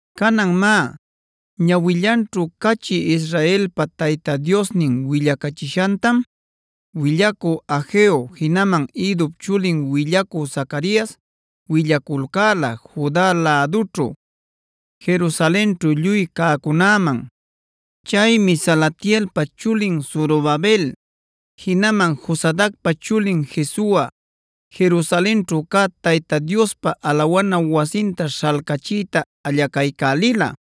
Canan má, ñawillanćhu cachï Israelpa Tayta Diosnin willacachishantam willacü Hageo jinaman Iddop chulin willacü Zacarias willaculcäla Juda lädućhu, Jerusalenćhu lluy cäcunäman. Chaymi Salatielpa chulin Zorobabel jinaman Josadacpa chulin Jesua Jerusalenćhu cä Tayta Diospa alawana wasinta śhalcachiyta allacaycälila.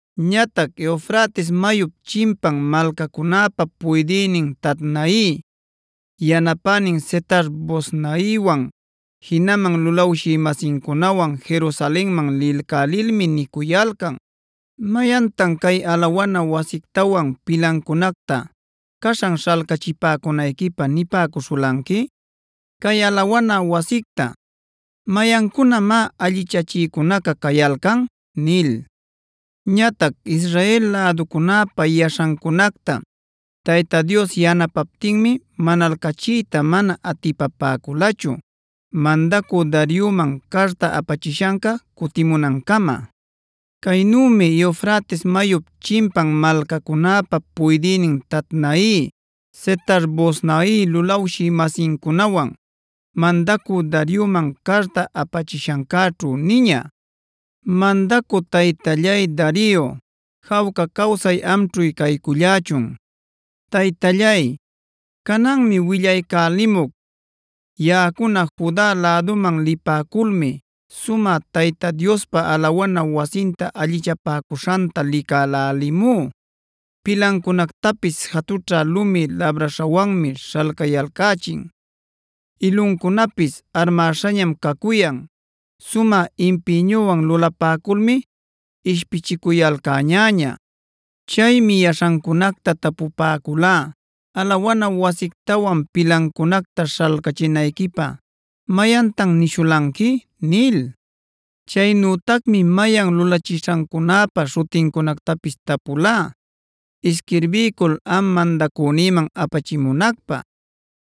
Ñatac Eufrates mayup chimpan malcacunäpa puydïnin Tatnai, yanapänin Setar-boznaiwan jinaman lulawshï-masincunawan Jerusalenman lilcälilmi nicuyalcan: “¿Mayantan cay alawana wasictawan pilancunacta caśhan śhalcachipäcunayquipä nipäcuśhulanqui? Cay alawana wasicta, ¿mayancunamá allichachïcunaca cayalcan?” nil. Ñatac Israel läducunäpa yaśhancunacta Tayta Dios yanapaptinmi manalcachiyta mana atipapäculachu mandacü Darioman carta apachishanca cutimunancama. Caynümi Eufrates mayup chimpan malcacunäpa puydïnin Tatnai, Setar-boznai lulawshï-masincunawan mandacü Darioman carta apachishancäćhu niña: “Mandacü taytallay Dario, jawca cawsay amćhu caycullächun. Taytallay, cananmi willaycälimuc. Yaꞌacuna Juda läduman lipäculmi sumä Tayta Diospa alawana wasinta allichapäcuśhanta licälälimú. Pilancunactapis jatućha lumi labräśhawanmi śhalcayalcächin, iluncunapis armäśhañam cacuyan. Sumä impïñuwan lulapäculmi ishpichicuyalcäñäña. Chaymi yaśhancunacta tapupäculá: ‘¿Alawana wasictawan pilancunacta śhalcachinayquipä mayantan nishulanqui?’ nil. Chaynütacmi mayan lulachishancunäpa śhutincunactapis tapulá isquirbiycul am mandacünïman apachimunacpä.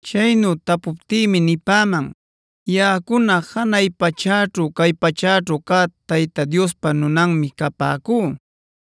Chaynu tapuptïmi nipäman: ‘Yaꞌacuna janay pachäćhu cay pachäćhu cä Tayta Diospa nunanmi capäcú.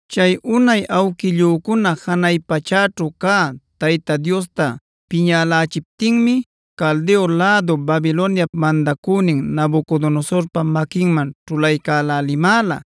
Chay unay awquillücuna janay pachäćhu cä Tayta Diosta piñälälichiptinmi Caldeo lädu Babiloniap mandacünin Nabucodonosorpa maquinman ćhulaycälälimäla.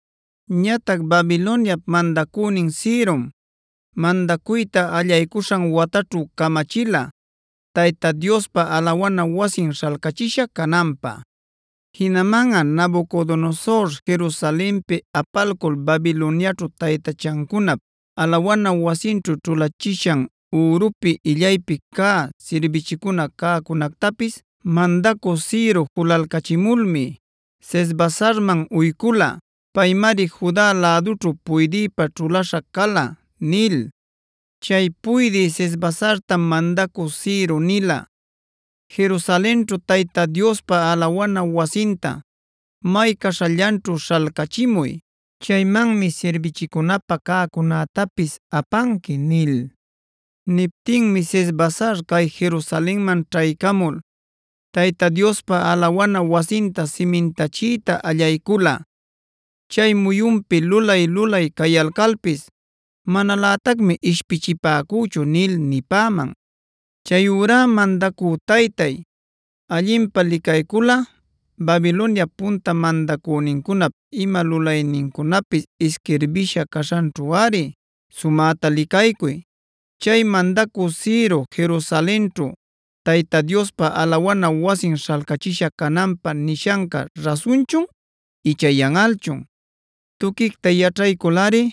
Ñatac Babiloniap mandacünin Cirom mandacuyta allaycuśhan wataćhu camachila Tayta Diospa alawana wasin śhalcachisha cananpä.d Jinamanꞌa Nabucodonosor Jerusalenpi apalcul Babiloniaćhu taytachancunap alawana wasinćhu ćhulachishan ürupi illaypi cä sirbichicuna cäcunactapis mandacü Ciro julalcachimulmi Sesbasarman uycula. Paymari Juda lädućhu puydïpä ćhulaśha cala’ nil. Chay puydï Sesbasartam mandacü Ciro nila: ‘Jerusalenćhu Tayta Diospa alawana wasinta may caśhallanćhu śhalcachimuy. Chaymanmi sirbichicunapä cäcunätapis apanqui’ nil. Niptinmi Sesbasar cay Jerusalenman ćhaycamul Tayta Diospa alawana wasinta simintachiyta allaycula. Chay muyunpi lulay-lulay cayalcalpis manalätacmi ishpichipäcüchu” nil nipäman. “Chayurá mandacü taytay, allinpä licayculꞌa, Babiloniap punta mandacünincunap ima lulaynincunapis isquirbisha caśhanćhuꞌari sumäta licaycuy. Chay mandacü Ciro Jerusalenćhu Tayta Diospa alawana wasin śhalcachisha cananpä nishanca rasunchun icha yanꞌalchun. Tuquicta yaćhayculꞌari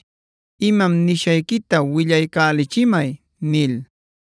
imam nishayquita willaycälichimay” nil.